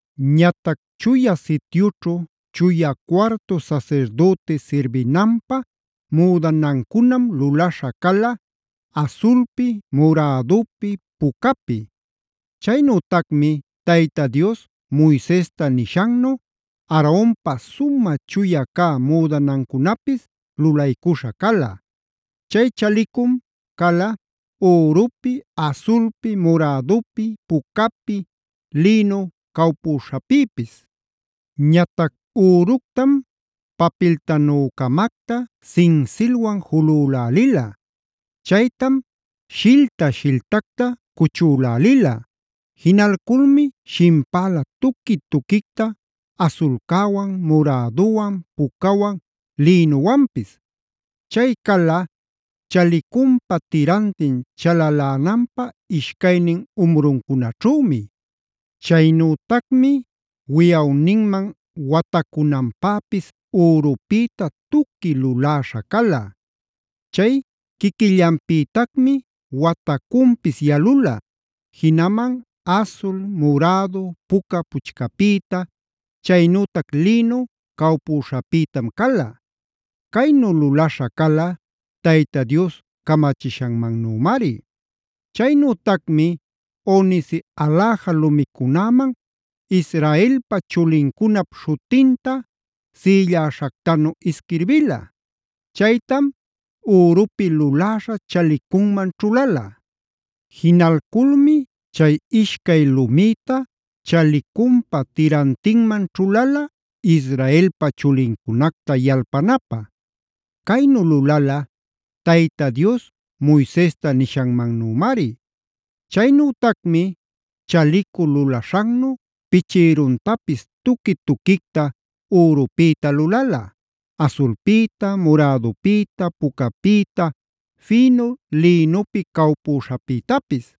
Ñatac Chuya Sityućhu chuya cuartu sasirdüti sirbinanpä müdanancunam lulaśha cala: asulpi, murädupi, pucapi. Chaynütacmi Tayta Dios Moisesta nishannu Aaronpa sumä chuya cä müdanancunapis lulaycuśha cala. Chay chalicum cala: ürupi, asulpi, murädupi, pucapi, lïnu cawpüśhapïpis. Ñatac üructam papiltanücamacta sinsilwan julülälila. Chaytam shilta-shiltacta cuchülälila. Jinalculmi shimpäla tuqui-tuquicta asulcäwan, muräduwan, pucawan, lïnuwanpis. Chay cala chalicunpa tirantin chalalänanpä ishcaynin umruncunaćhümi. Chaynütacmi wiyawninman watacunanpäpis ürupïta tuqui luläśha cala. Chay quiquillanpïtacmi watacunpis yalula. Jinaman asul, murädu, puca puchcapïta, chaynütac lïnu cawpuśhapïtam cala. Caynu lulaśha cala Tayta Dios camachishannümari. Chaynütacmi onice aläja lumicunäman Israelpa chulincunap śhutinta sïlläśhactanu isquirbila. Chaytam ürupi luläśha chalachicunman ćhulala. Jinalculmi chay ishcay lumïta chalicunpa tirantinman ćhulala, Israelpa chulincunacta yalpanapä. Caynu lulala Tayta Dios Moisesta nishanmannümari. Chaynütacmi chalicu lulaśhannu pichïruntapis tuqui-tuquicta ürupïta lulala: asulpïta, murädupïta, pucapïta, fïnu lïnupi cawpüśhapïtapis.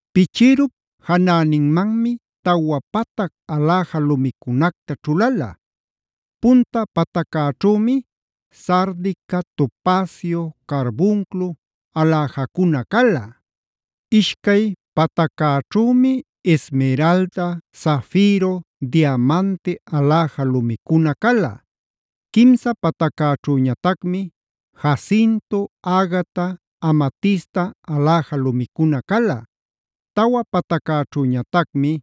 Pichïrup janäninmanmi tawa patac aläja lumicunacta ćhulala. Punta pataccäćhümi sardica, topacio, carbunclo aläjacuna cala. Ishcay pataccäćhümi esmeralda, zafiro, diamante aläja lumicuna cala. Quimsa pataccäćhüñatacmi jacinto, agata, amatista aläja lumicuna cala. Tawa pataccäćhüñatacmi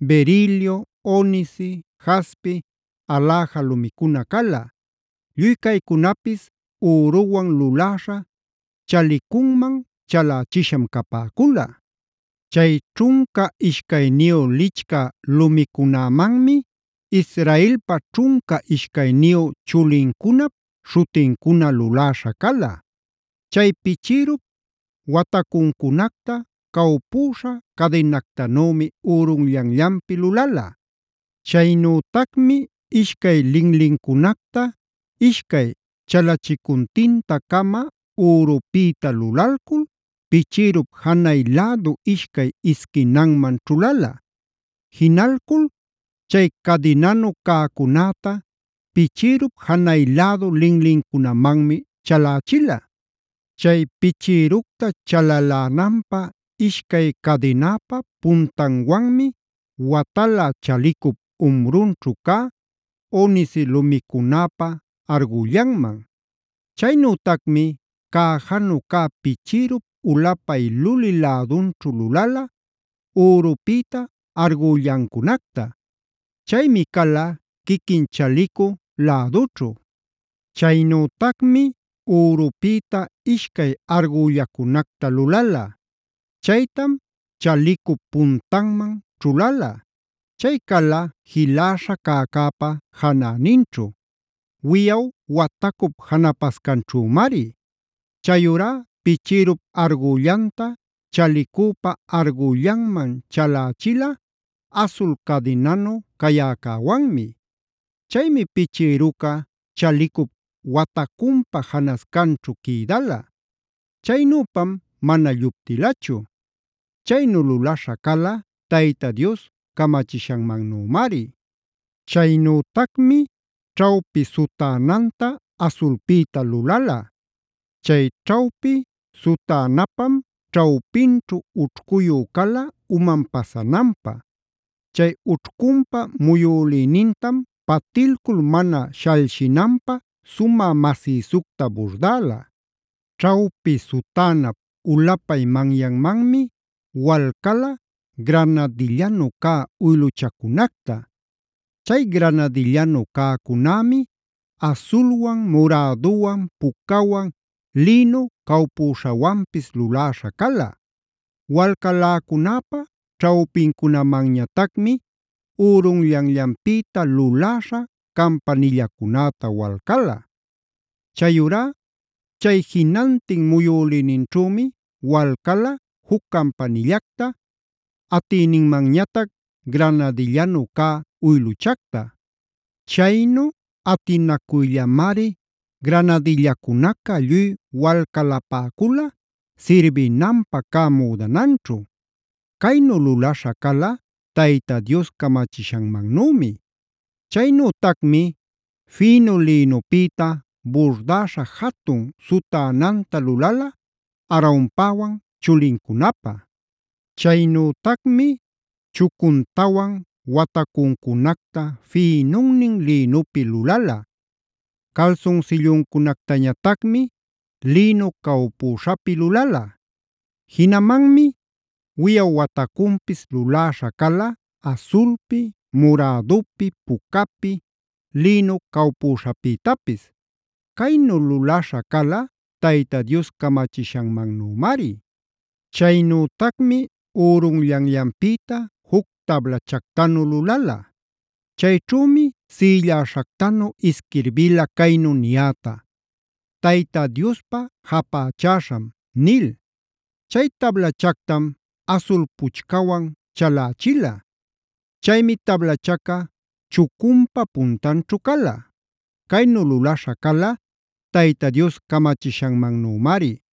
berilio, onice, jaspe aläja lumicuna cala. Lluy caycunapis üruwan luläśha chalachicunman chalächisham capäcula. Chay ćhunca ishcayniyu lichcä lumicunämanmi Israelpa ćhunca ishcayniyu chulincunap śhutincuna luläśha cala. Chay pichïrup watacuncunacta cawpüśha cadinactanümi ürunllanllanpi lulala. Chaynütacmi ishcay linlincunacta, ishcay chalachicuntinta-cama ürupïta lulalcul pichïrup janay lädu ishcay isquinanman ćhulala. Jinalcul chay cadinanu cäcunäta pichïrup janay lädu linlincunamanmi chalächila. Chay pichïructa chalalänanpä ishcay cadinäpa puntanwanmi watala chalicup umrunćhu cä onice lumicunäpa argüllanman. Chaynütacmi cäjanu cä pichïrup ulapay lulï lädunćhu lulala ürupïta argüllancunacta. Chaymi cala quiquin chalicu lädućhu. Chaynütacmi ürupïta ishcay argüllacunacta lulala. Chaytam chalicup puntanman ćhulala. Chay cala jiläsha cäcäpa janäninćhu; wiyaw watacup janapascanćhümari. Chayurá pichïrup argüllanta chalicüpa argüllanman chalächila asul cadinanu cayäcäwanmi. Chaymi pichïruca chalicup watacunpa janascanćhu quïdala. Chaynüpam mana lluptilachu. Chaynu lulaśha cala Tayta Dios camachishannümari. Chaynütacmi ćhawpi sutänanta asulpïta lulala. Chay ćhawpi sutänapam ćhawpinćhu ućhcuyu cala uman pasananpä. Chay ućhcunpa muyülïnintam patilcul mana shalshinanpä sumä masïsucta burdäla. Ćhawpi sutänap ulapay manyanmanmi walcala granadillanu cä uyluchacunacta. Chay granadillanu cäcunämi asulwan, muräduwan, pucawan, lïnu cawpüśhawanpis luläśha cala. Walcaläcunäpä ćhawpincunamanñatacmi ürunllanllanpïta luläśha campanillacunäta walcäla. Chayurá chay jinantin muyülïninćhümi walcala juc campanillacta, atïninmanñatac granadillanu cä uyluchacta. Chaynu atinacuyllamari granadillacunaca lluy walcalapäcula sirbinanpä cä müdananćhu. Caynu lulaśha cala Tayta Dios camachishannümi. Chaynütacmi fïnu lïnupïta burdäsha jatun sutänanta lulala Aaronpäwan chulincunapä. Chaynütacmi chucuntawan watacuncunacta fïnunnin lïnupi lulala. Calsunsilluncunactañatacmi lïnu cawpüśhapi lulala. Jinamanmi wiyaw watacunpis luläśha cala: asulpi, murädupi, pucapi, lïnu cawpüśhapïtapis. Caynu lulaśha cala Tayta Dios camachishannümari. Chaynütacmi ürunllanllanpïta juc tablachactanu lulala. Chayćhümi sïlläśhactanu isquirbila caynu niyäta: Tayta Diospä japächäśham” nil. Chay tablachactam, asul puchcawan chalächila. Chaymi tablachaca chucunpa puntanćhu cala. Caynu lulaśha cala Tayta Dios camachishannümari.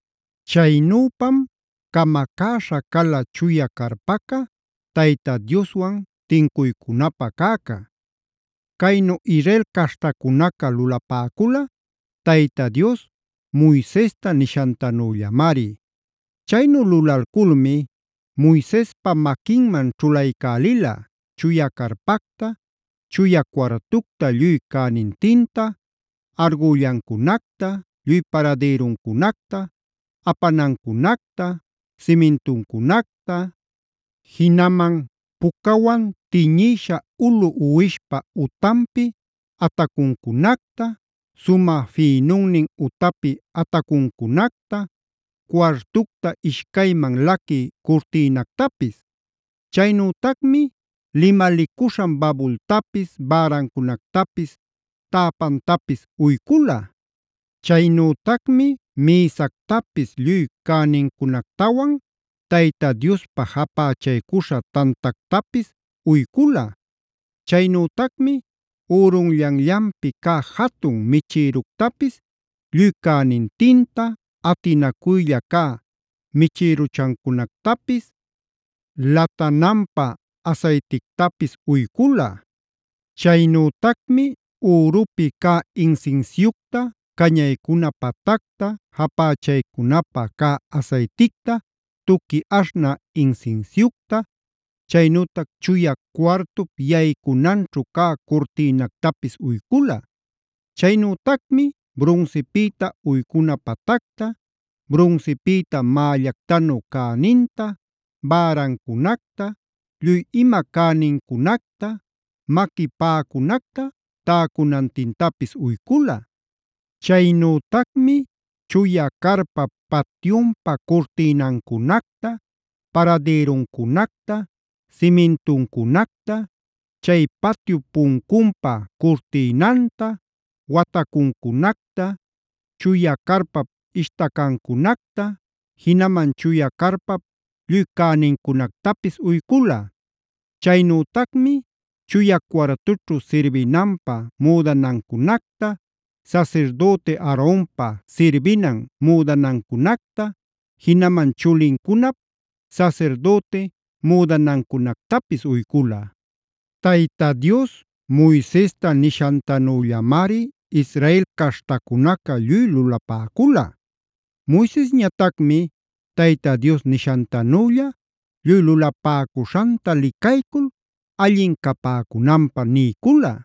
Chaynüpam camacäśha cala chuya carpaca, Tayta Dioswan tincuycunapä cäcä. Caynu Israel caśhtacunaca lulapäcula Tayta Dios Moisesta nishantanüllamari. Chaynu lulalculmi Moisespa maquinman ćhulaycälila: chuya carpacta, chuya cuartucta lluy cänintinta, argüllancunacta, lluy paradïruncunacta, apanancunacta, simintuncunacta, jinaman pucawan tiñïsha ulu uwishpa utanpi atacuncunacta, sumä fïnunnin utapi atacuncunacta, cuartucta ishcayman laquï curtïnactapis. Chaynütacmi limalicuśhan babultapis, bärancunactapis, täpantapis uycula. Chaynütacmi mïsactapis lluy cänincunactawan, Tayta Diospä japächaycuśha tantactapis uycula. Chaynütacmi ürunllanllanpi cä jatun michïructapis lluy cänintinta, atinacuylla cä michïruchancunactapis, latananpä asaytictapis uycula. Chaynütacmi ürupi cä insinsiucta cañaycuna patacta, japächaycunapä cä asayticta, tuqui aśhnä insinsiucta, chaynütac chuya cuartup yaycunanćhu cä curtïnactapis uycula. Chaynütacmi brunsipïta uycuna patacta, brunsipïta mällactanu cäninta, bärancunacta, lluy ima cänincunacta, maqui paꞌacunacta täcunantintapis uycula. Chaynütacmi chuya carpap patyunpa curtïnancunacta, paradïruncunacta, simintuncunacta, chay patyup puncunpä curtïnanta, watacuncunacta, chuya carpap ishtacancunacta, jinaman chuya carpap lluy cänincunactapis uycula. Chaynütacmi chuya cuartućhu sirbinanpä müdanancunacta, sasirdüti Aaronpä sirbinan müdanancunacta, jinaman chulincunap sasirdüti müdanancunactapis uycula. Tayta Dios Moisesta nishantanüllamari Israel caśhtacunaca lluy lulapäcula. Moisesñatacmi Tayta Dios nishantanülla lluy lulapäcuśhanta licaycul allin capäcunanpä niycula.